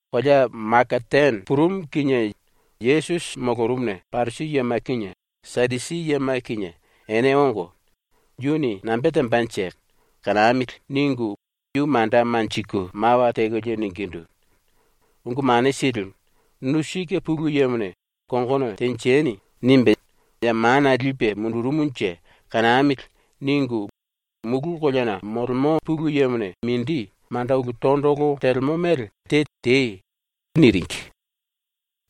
⸤Kolea Makatane purumu⸥ kinie Yesusi molorumuna Parisi yema kinie Sadusi yema kinie ene ongo, ‘Yuni nambe tembanje? Kanamili.’ ningu yu manda manjiku mawa tekolie ningindu: “Ungu Mane Silimu, ‘Nu sike Pulu Yemone ‘Kongono tenjeni.’ nimbe ya mana lipe mundurumunje kanamili.’ ningu mulu koleana molemo Pulu Yemone mindi manda ulu tondolo telemo mele te tei.” niringi.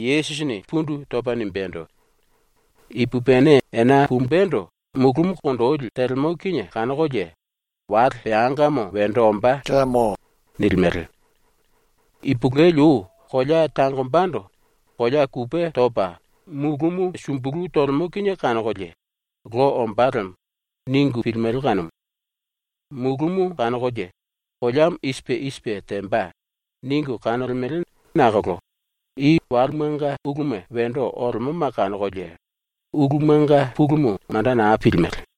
Yesusini pundu topa nimbendo: “Ipupini ena pumbendo mulúmu kondoli telemo kinie kanokolie ‘wale peangamo wendo ombá.’ nilimele. Ipulueli ou kolea tangombando kolea kupe topa mulúmu sumbulu tolemo kinie kanokolie ‘Lo ombá lemo.’ ningu pilimele kanumu. Mulúmu kanokolie ‘koleamo i sipe i sipe temba.’ ningu kanolemele nakolo i walemanga uluma wendo olemoma kanokolie ulumanga pulumu manda naa pilimele.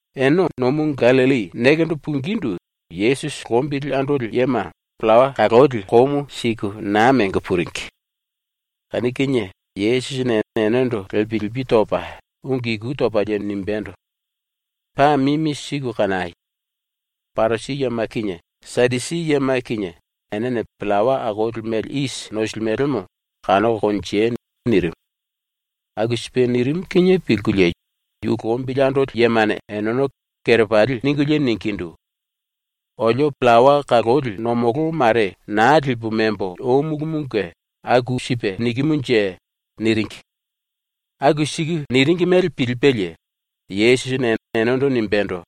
Ene ⸤nomu Gallilli⸥ nekendo pungindu ⸤Yesusi⸥ lombili andoli yema pillawa kaloli komu siku na mengo puringi. ⸤Kanu kinie⸥ Yesusini enendo ⸤lepi lepi topa ungu iku topalie⸥ nimbendo: “Paa mimi siku kanai! Parisi yema kinie Sadusi yema kinie enene pillawa akoli mele isi nosilimelemo kanoko konjei!” nirimu. Aku sipe nirimu kinie pilkulie yu lombili andoli yemane eneno kerepali ningulie ningindu: “Olio pillawa kaloli ⸤nomolo⸥ mare na lipu membo omulumunge aku sipe nikimunje.” niringi. Aku siku niringi mele pilipelie Yesusini enendo nimbendo: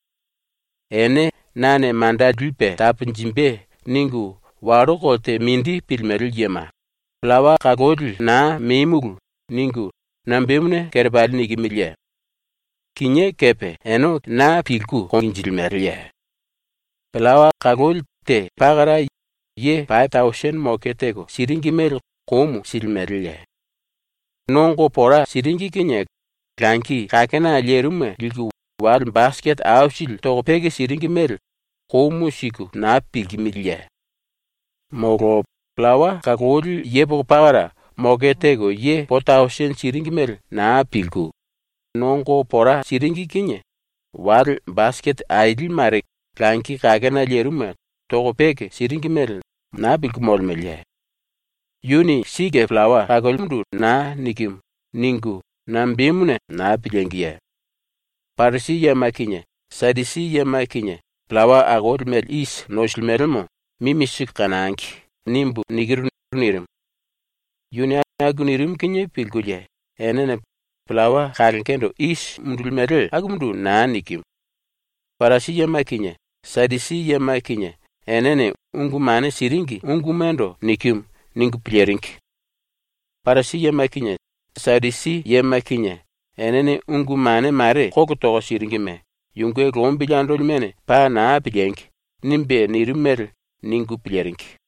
“Ene ‘nane manda lipe taponjimbe.’ ningu wallo kolte mindi pilimele yema, “Pillawa kaloli naa memulu.” ningu nambemuna kerepali nikimiliye? Ene kinié kepe naa pilku konjilimeleye? Pillawa kaloli te pakara ye pape tausini moke teko siringi mele komu silimeleye? ⸤Nongo pora siringi kinie⸥ langi kakena lerimuma liku wale basikete aisili toko peke siringi mele komu siku na pilkimiliye? “Molo pillawa kaloli yepoko pakara moke teko ye po tausini siringi mele naa pilku, ⸤nongo pora siringi kinie⸥ wale basikete aili mare langi kakena lerimuma toko peke siringi mele naa pilku molemeleye? ‘Yuni sike pillawa kalolimundu naa nikimu.’ ningu nambemuna naa pilíngiye? ‘Parisi yema kinie Sadusi yema kinie pillawa akoli mele isi nosilimelemo mimi siku kanangi.’ nimbu nikiru.” nirimu. Yuni aku nirimu kinie pilkulie enene ‘pillawa kalongendo isi mundulimele akumundu naa nikimu. Parisi yema kinie Sadusi yema kinie enene ungu mane siringi ungumando nikimu.’ ningu piliringi. ⸤‘Parisi yema kinie Sadusi yema kinie enene ungu mane mare kolo toko siringime yunge lombili andolimene paa na piliengi!’ nimbe nirimu mele ningu piliringi.⸥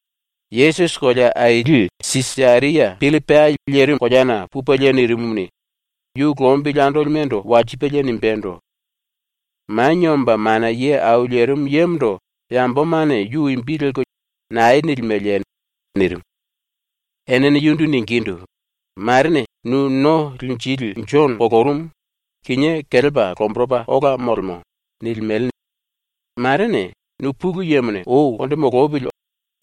Yesusi kolea aili Sisaria Pillipai lerimu koleana pupelie nirimumuni, yu lombili andolimendo walsipelie nimbendo: “Manie Omba Mana Ye Au Lerimu Yemondo yambomane yu imbi lelko nae nilimeleye?” nirimu. Enene yundu ningindu: “Marene “Nu No Linjili Jono ⸤kolorumu, kinié kelepa lomboropa ola molemo⸥.” ningu pilku, marene “Nu ⸤Pulu Yemone ou konde molopili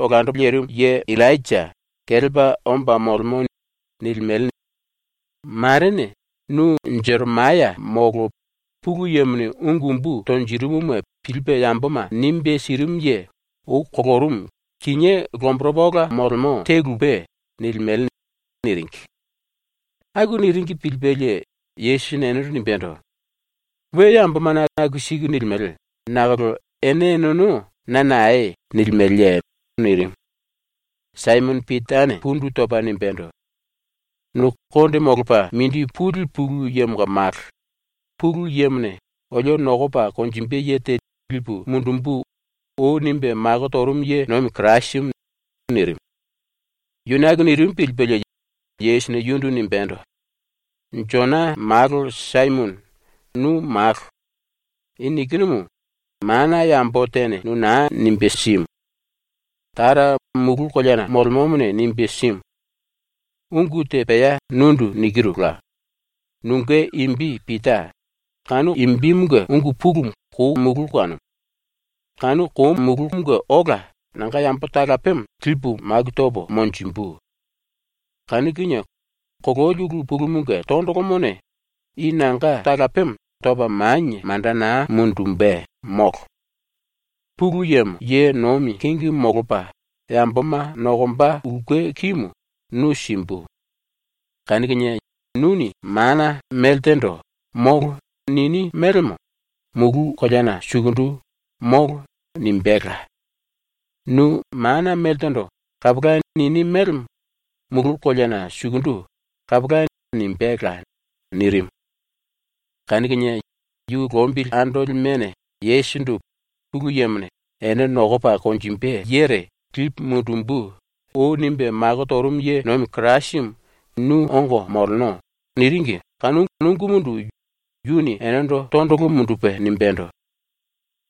olando lirimu ye⸥ Illainja kelepa omba molemo.” ningu pilku, marene nu “Jeremaya molo Pulu Yemone ungu umbu tonjirimuma pilipe yamboma nimbe sirimu ye ⸤ou kolorumu kinié lomboropa ola molemo⸥ te lupe.” nilimele.” niringi. Aku niringi pilipelie Yesusini enendo nimbendo: “⸤We yambomane aku siku nilimele⸥ nakolo ene eneno na nae nilimeleye?” nirimu. Saimono Pitane pundu topa nimbendo: “Nu Konde Molopa Mindi Puli Pulu Yemonga Malo, ⸤Pulu Yemone ‘Olio nokopa konjimbe ye te lipu mundumbu.’ ou nimbe mako torumu ye nomi⸥ Kirasimu.” nirimu. Yuni aku nirimu pilipelie Yesusini yundu nimbendo: “Jona Malo Saimono, nu malo. I nikinumu mana yambo tene nu na nimbe simu. Tara mulu koleana molemomone nimbe simu. Ungu te pea nundu nikirula: Nunge imbi Pita, (kanu imbimunge ungu pulumu ‘kou’ kanumu). Kanu koumunge ola nanga yambo talapemo lipu maku topo monjimbu. Kanu kinie kololi ulu pulumunge tondolomone i nanga talapemo topa manie manda na mundumbe, molo. Pulu Yemo ye nomi kingi molopa yamboma nokomba ulke kimu nu simbu. Kanu kinie nuni mana meltendo “Molo.” nini mélemo mulu koleana sukundu “Molo.” nimbéla. Nu mana meltendo “Kapola.” nini mélemo mulu koleana sukundu “Kapola.” nimbéla.” nirimu. Kanu kinie yu lombili andolimene Yesusindu “Pulu Yemone “Ene nokopa konjimbe yere lipu mundumbu.” nimbe mako torumu ye nomi Kirasimu nu ongo moleno.” niringi kanu ungumundu yuni enendo tondolo mundupe nimbendo: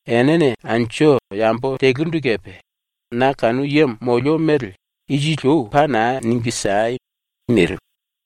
“Enene anju yambo telurindu kepe na kanu yemo molio mele ⸤isili ou⸥ paa na ningu siei!” nirimu.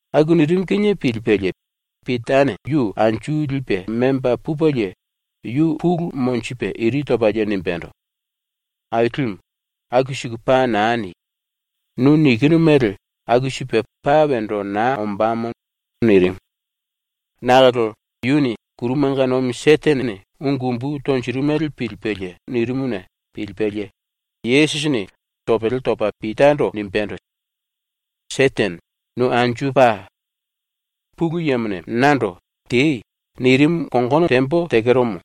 ⸤Aku nirimu kinie pilipelie⸥ Pitane yu anju lipe memba pupelie yu pulu monjipe iri topalie nimbendo: “Ailimu, aku siku paa naa ni! Nu nikinu mele aku sipe paa wendo naa ombámo.” nirimu. Nakolo ⸤yuni kurumanga nomi Setenene ungu umbu tonjirimu mele pilipelie nirimuna pilipelie⸥ Yesusini topele topa Pitando nimbendo: “Setene, nu anju pa! Pulu Yemone nando “Tei.” nirimu kongono tembo tekeromo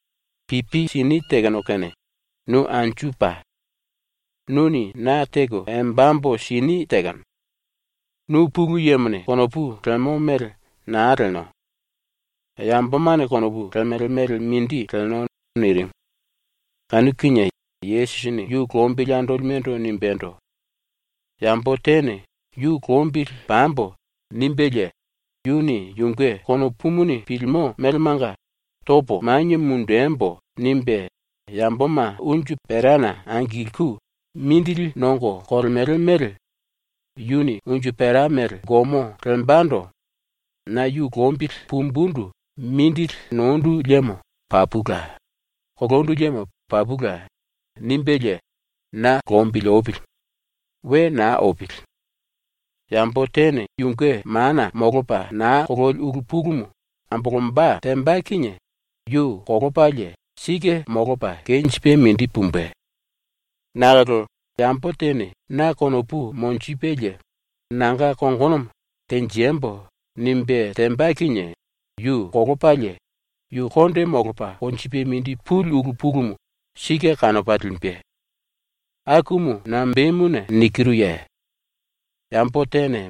pipi sini tekeno kene nu anju pa! Nuni na teko embambo sini tekeno. Nu Pulu Yemone konopu lemo mele naa leno. Yambomane konopu lemele mele mindi leno.” nirimu. Kanu kinie Yesusini yu lombili andolimendo nimbendo: “Yambo tene ‘Yu lombili pambo.’ nimbelie yuni yunge konopumuni pilimo melemanga ‘Topo manie mundembo.’ nimbe yamboma unju perana angilku mindili nongo kolemele mele yuni unju pera mele gomo lembando ‘Na yu lombili pumbundu mindili nondu liemo papula; kolondu liemo papula.’ nimbelie na lombili opili. We na opili. Yambo tene yunge mana molopa na kololi ulu pulumu ambolomba temba kinie yu kolopalie sike molopa kenjipe mindi pumbe. Nakolo yambo tene na konopu monjipelie nanga kongonomo “Tenjembo.” nimbe temba kinie yu kolopalie yu konde molopa konjipe mindi puli ulu pulumu sike kanopa limbe. ⸤Akumu nambemuna nikiruye?⸥ Yambo tene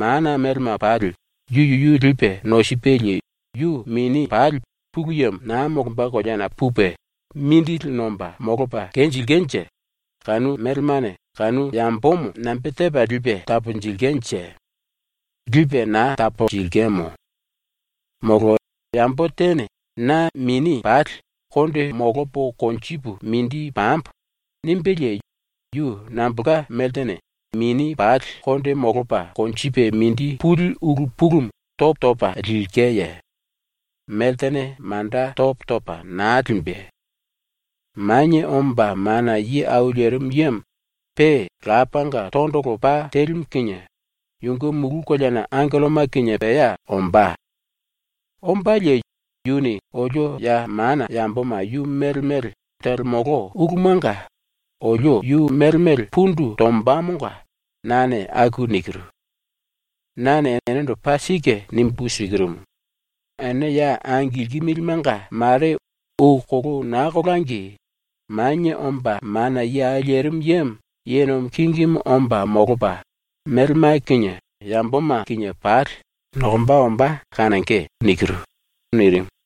mana melema pali yu yuyu lipe nosipelie yu mini pali Pulu Yemo na molomba koleana pupe mindili nomba molopa kenjilkenje kanu melemane kanu yambomo nambe tepa lipe taponjilkenje? Lipe na taponjilkemo. Molo yambo tene ‘Na mini pali konde molopo konjipu mindi pambo.’ nimbelie yu nambolka meltene mini pali konde molopa konjipe mindi puli ulu pulumu topo topa lilkeye? Meltene manda topo topa na limbe. “Manie Omba Mana Ye Au Lerimu Yemo pe Lapanga tondolo pa telimu kinie yunge ⸤mulu koleana⸥ angelloma kinie pea ombá. Ombalie yuni olio ya mana yamboma yu mele mele telemolo ulumanga olio yu mele mele pundu tombamonga nane aku nikiru. “Nane enendo paa sike nimbu sikirumu: Ene ya angilkimilimenga mare ou kolou na kolangi Manie Omba Mana Ye Au Lerimu Yemo ye nomi kingimu omba molopa melema kinie yamboma kinie pali nokomba ombá kanonge.” nirimu.